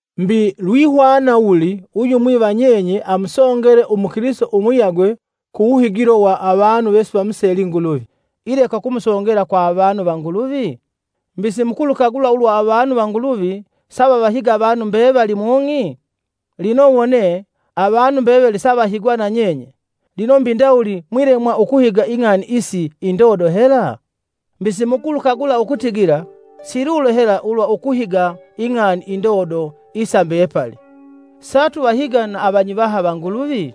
Mbi lwihwana wuli uyumwi va nyenye amusongele umukilisito umuyagwe ku wuhigilo wa avanu vesivamuseli Nguluvi ileka ukumusongela kwa avanu va Nguluvi? Mbi, simukulukagula ulwa avanu va Nguluvi savavahiga avanu mbevali mung'i? Lino wone, avanu mbevali savahigwa nanyenye, lino mbi ndawuli mwilemwa ukuhiga ing'ani isi indodo hela? Mbi, simukulukagula ukutigila, silulo hela ulwa ukuhiga ing'ani indodo isa mbepali, satuvahiga na avanyivaha va Nguluvi?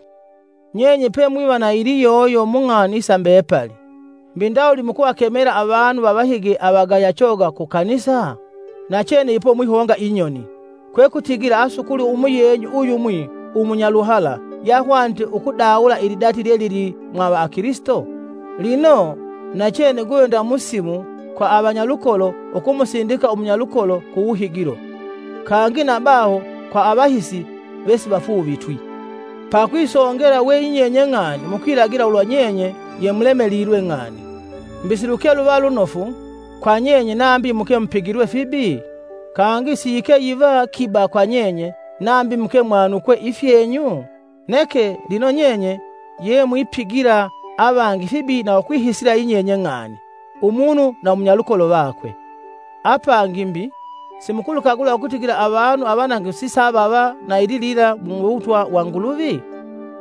Nyenye pemwiva na iliyoyo mung'ani isa mbepali, mbi ndawuli mukuvakemela avanu vavahige avagaya choga ku kanisa? Nachene ipo mwihonga inyoni! Kwekutigila asukuli umuyenyu uyumwi umunyaluhala yahwanite ukudawula ilidati lyelili mwa avakilisito? Lino, nachene guve nda musimu kwa avanyalukolo ukumusindika umunyalukolo ku wuhigilo, kangi na baho kwa avahisi vesivafuuvitwi. Pakwisongela weyinyenye ng'ani mukwilagila ulwa nyenye yemulemelilwe ng'ani! Mbi siluke luva lunofu, kwa nyenye nambi muke mupigilwe fibi? Kangi siyike yiva kiba kwa nyenye, nambi muke mwanukwe ifyenyu? Neke, lino nyenye yemwipigila avangi fibi na ukwihisila yinyenye ng'ani, umunu na munyalukolo vakwe! Apangi mbi, simukulukagula ukutigila avanu avanangifu sisavava, na ililila mu Uwutwa wa Nguluvi?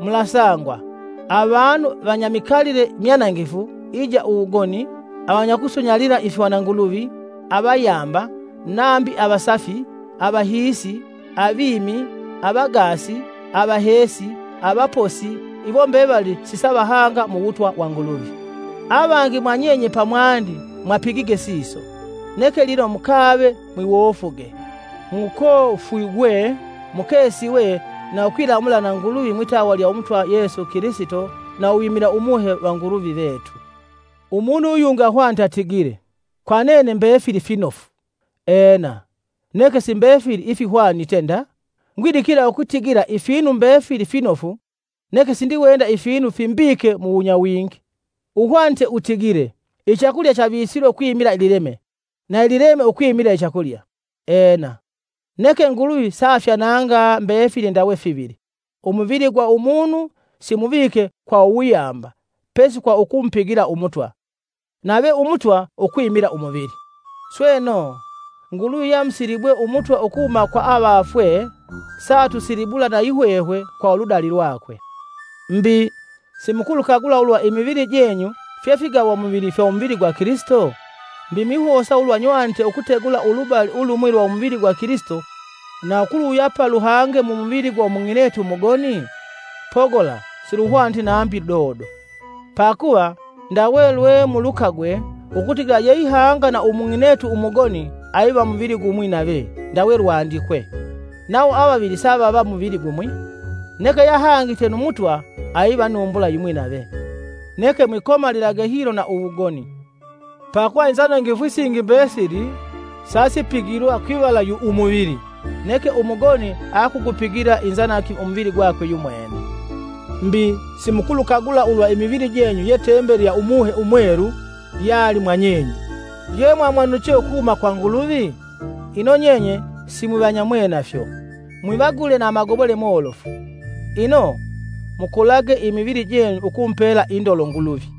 Mulasangwa, avanu vanyamikalile imyanangifu, ija, wugoni, avanyakusunyalila ifihwananguluvi, avayamba, nambi avasafi, avahiisi, avimi, avagaasi, avaheesi, avaposi, iwo mbevali sisavahanga muwutwa wa Nguluvi. Avangi mwa nyenye pamwandi mwapigige siso, neke lino mukave mwiwofuge, mukofwigwe, mukesiwe na ukwilamula na Nguluvi mwitawa lya Umutwa Yesu Kilisito na uwimila Umuhe va Nguluvi vetu. Umunu uyungi ahwanite atigile, “Kwa nene mbefili finofu.” Ena, neke si mbefili ifihwanite nda, ngwidikila ukutigila ifinu mbefili finofu neke sindiwenda ifinu fimbike muwunyawingi. Uhwanite utigile, “Ichakulya chavisilwe ukwimila lileme, na ilileme ukwimila ichakulya.” Ena, neke Nguluvi saafyananga mbefili ndawe fivili. Umuvili gwa umunu simuvike kwa uwuyamba pesi kwa ukumupigila Umutwa, nave Umutwa ukwimila umuvili. Sweno, Nguluvi yamusilibwe Umutwa ukuhuma kwa avafwe saatusilibula nayihwehwe kwa uludali lwakwe. Mbi, simukulukagula ulwa imivili jenyu fye figawamuvili fya umuvili gwa Kilisito? Mbi, mwihosa ulwa nywanite ukutegula ulubali ulumwi lwa umuvili gwa Kilisito na ukuluwuyapa luhange mumuvili gwa umung'inetu umugoni? Pogola siluhwaniti nambi ludodo. Pakuva, ndawe lwemulukagwe, ukutigila yeihanga na umung'inetu umugoni aiva muvili gumwi nave-ndawe lwandikwe, “Nawo avavili savava muvili gumwi.” Neke yahangite nu Mutwa aiva numbula yimwi nave. Neke mwikomalilage hilo na uwugoni. Pakuva inzanangifu isingi mbesili sasipigilwa kwivala kwa umuvili neke umugoni akugupigila inzanangifu umuvili gwakwe yumwene. Mbi, simukulukagula ulwa imivili jenyu ye tembeli ya Umuhe Umwelu yali mwanyenye, yemwamwanuche ukuhuma kwa Nguluvi? Ino nyenye, simwivanyamwenafyo. Mwivagule na amagobole molofu, ino, mukolage imivili jenyu ukumupela indolo Nguluvi.